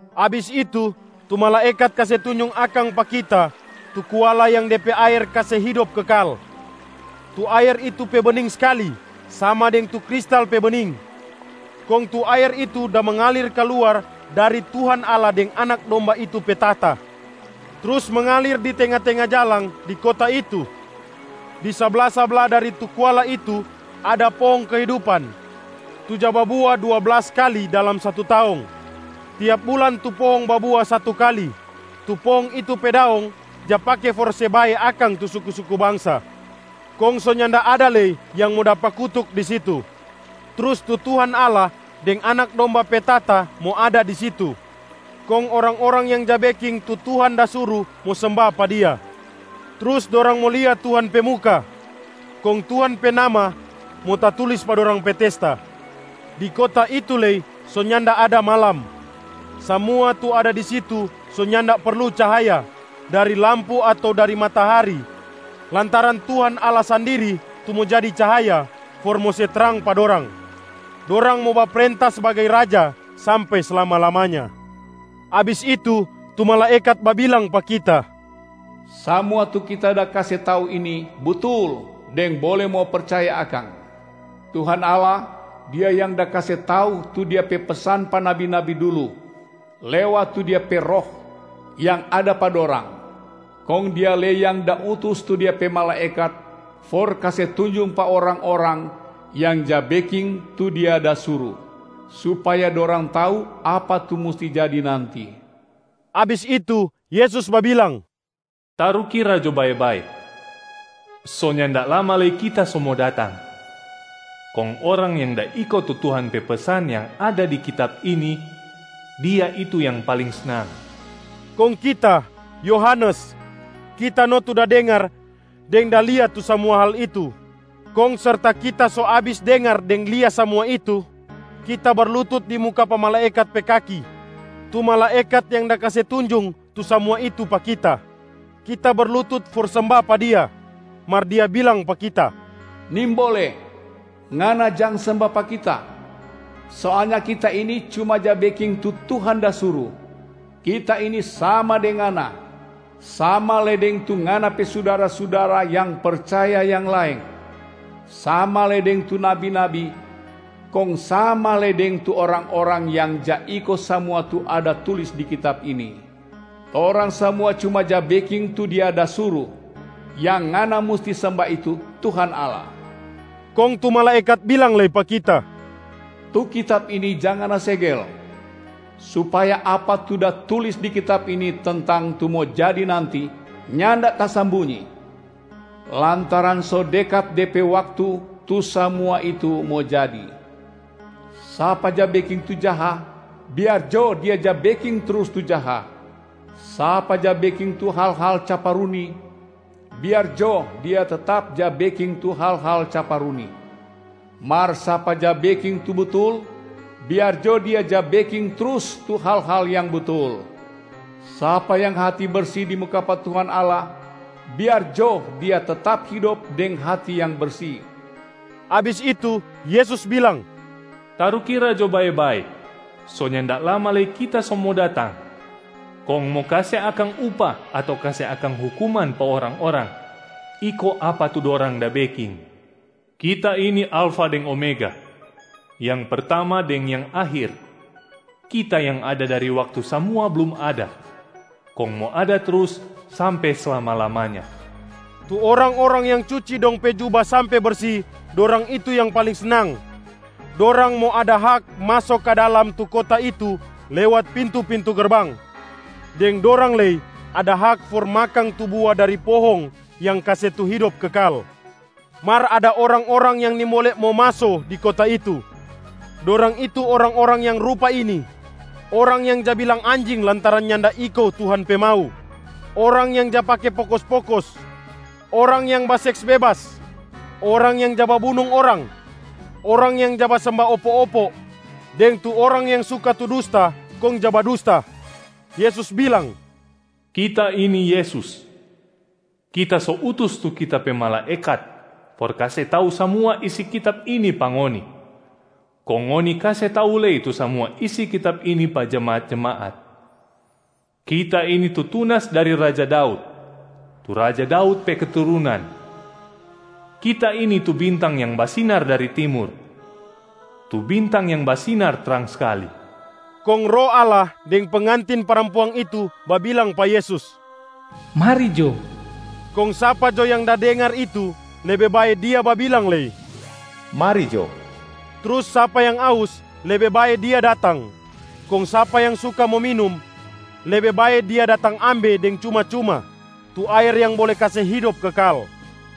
Abis itu, tu malaekat kase tunjung akang pa kita tu kuala yang de pe aer kase hidop kekal. Tu aer itu pe bening skali sama deng tu kristal pe bening. Kong tu aer itu da mengalir kaluar dari Tuhan Allah deng Anak Domba itu pe tahta, trus mengalir di tenga-tenga jalang di kota itu. Di sabla-sabla dari tu kuala itu ada pohong kehidupan tu ja babua dua blas kali dalam satu taong, tiap bulan tu pohong babua satu kali. Tu pohong itu pe daong ja pake for se bae akang tu suku-suku bangsa. Kong so nyanda ada lei yang mo dapa kutuk di situ. Trus tu Tuhan Allah deng Anak Domba pe tahta mo ada di situ, kong orang-orang yang ja beking tu Tuhan da suru mo semba pa Dia. Trus dorang mo lia Tuhan pe muka, kong Tuhan pe nama mo tatulis pa dorang pe testa. Di kota itu lei so nyanda ada malam. Samua tu ada di situ so nyanda perlu cahaya dari lampu ato dari matahari lantaran Tuhan Allah sandiri tu mo jadi cahaya for mo se trang pa dorang. Dorang mo baprenta sbagai raja sampe slama-lamanya.Yesus kase tau kalu Dia mo datang ulang Abis itu, tu malaekat babilang pa kita, “Samua tu kita da kase tau ini butul deng bole mo percaya akang. Tuhan Allah, Dia yang da kase tau tu Dia pe pesan pa nabi-nabi dulu lewat tu Dia pe Roh yang ada pa dorang. Kong Dia lei yang da utus tu Dia pe malaekat for kase tunjung pa orang-orang yang ja beking tu Dia da suru, supaya dorang tau apa tu musti jadi nanti.” Abis itu Yesus babilang, “Tarukira jo bae-bae, so nyanda lama lei Kita so mo datang. Kong orang yang da iko tu Tuhan pe pesan yang ada di kitab ini, dia itu yang paling snang.” Kong kita, Yohanes, kita no tu da dengar deng da lia tu samua hal itu. Kong serta kita so abis dengar deng lia samua itu, kita berlutut di muka pa malaekat pe kaki, tu malaekat yang da kase tunjung tu samua itu pa kita. Kita berlutut for semba pa dia. Mar dia bilang pa kita, “Nimbole! Ngana jang semba pa kita! Soalnya kita ini cuma ja beking tu Tuhan da suru. Kita ini sama deng ngana, sama lei deng tu ngana pe sudara-sudara yang percaya yang laeng, sama lei deng tu nabi-nabi, kong sama lei deng tu orang-orang yang ja iko samua tu ada tulis di kitab ini. Torang samua cuma ja beking tu Dia da suru. Yang ngana musti semba itu Tuhan Allah!” Kong tu malaekat bilang lei pa kita, “Tu kitab ini jang ngana segel, supaya apa tu da tulis di kitab ini tentang tu mo jadi nanti nyanda tasambunyi, lantaran so dekat de pe waktu tu samua itu mo jadi. Sapa ja beking tu jaha, biar jo dia ja beking trus tu jaha, sapa ja beking tu hal-hal caparuni, biar jo dia tetap ja beking tu hal-hal caparuni. Mar sapa ja beking tu butul, biar jo dia ja beking trus tu hal-hal yang butul, sapa yang hati bersi di muka pa Tuhan Allah, biar jo dia tetap hidop deng hati yang bersi!” Abis itu Yesus bilang, “Tarukira jo bae-bae, so nyanda lama lei Kita so mo datang kong mo kase akang upah ato kase akang hukuman pa orang-orang, iko apa tu dorang da beking. Kita ini Alfa deng Omega, yang Pertama deng yang Akhir, Kita yang ada dari waktu samua blum ada, kong mo ada trus sampe slama-lamanya.” Tu orang-orang yang cuci dong pe juba sampe bersi, dorang itu yang paling snang. Dorang mo ada hak maso ka dalam tu kota itu lewat pintu-pintu gerbang, deng dorang lei ada hak for makang tu bua dari pohong yang kase tu hidop kekal. Mar ada orang-orang yang nimbole mo maso di kota itu. Dorang itu orang-orang yang rupa ini: orang yang ja bilang anjing lantaran nyanda iko Tuhan pe mau, orang yang ja pake pokos-pokos, orang yang baseks bebas, orang yang ja babunung orang, orang yang ja basemba opo-opo, deng tu orang yang suka tu dusta kong ja badusta. Yesus bilang, “Kita ini Yesus. Kita so utus tu Kita pe malaekat for kase tau samua isi kitab ini pa ngoni, kong ngoni kase tau lei tu samua isi kitab ini pa jemaat-jemaat. Kita ini tu tunas dari Raja Daud, tu Raja Daud pe keturunan. Kita ini tu bintang yang basinar dari timur, tu bintang yang basinar trang skali.” Kong Roh Allah deng pengantin parampuang itu babilang pa Yesus, “Mari jo!” Kong sapa jo yang da dengar itu, lebe bae dia babilang lei, “Mari jo!” Trus sapa yang aus, lebe bae dia datang. Kong sapa yang suka mo minum, lebe bae dia datang ambe deng cuma-cuma tu aer yang bole kase hidop kekal.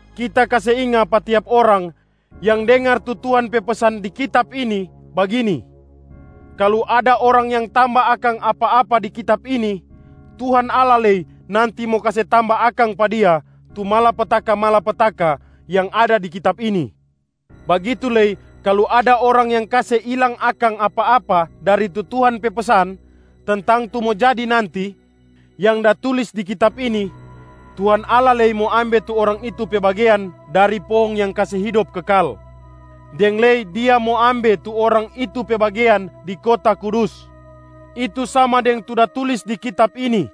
Kita kase inga pa tiap orang yang dengar tu Tuhan pe pesan di kitab ini bagini, “Kalu ada orang yang tamba akang apa-apa di kitab ini, Tuhan Allah lei nanti mo kase tamba akang pa dia tu malapetaka-malapetaka yang ada di kitab ini. Bagitu lei, kalu ada orang yang kase ilang akang apa-apa dari tu Tuhan pe pesan tentang tu mo jadi nanti yang da tulis di kitab ini, Tuhan Allah lei mo ambe tu orang itu pe bagean dari pohong yang kase hidop kekal, deng lei Dia mo ambe tu orang itu pe bagean di kota kudus, itu sama deng tu da tulis di kitab ini.”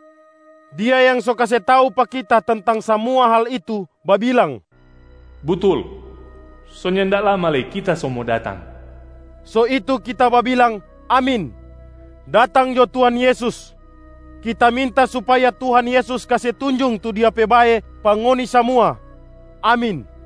Dia yang so kase tau pa kita tentang samua hal itu babilang, “Butul, so nyanda lama lei Kita so mo datang!” So itu kita babilang, “Amin. Datang jo Tuhan Yesus!” Kita minta supaya Tuhan Yesus kase tunjung tu Dia pe bae pa ngoni samua! Amin.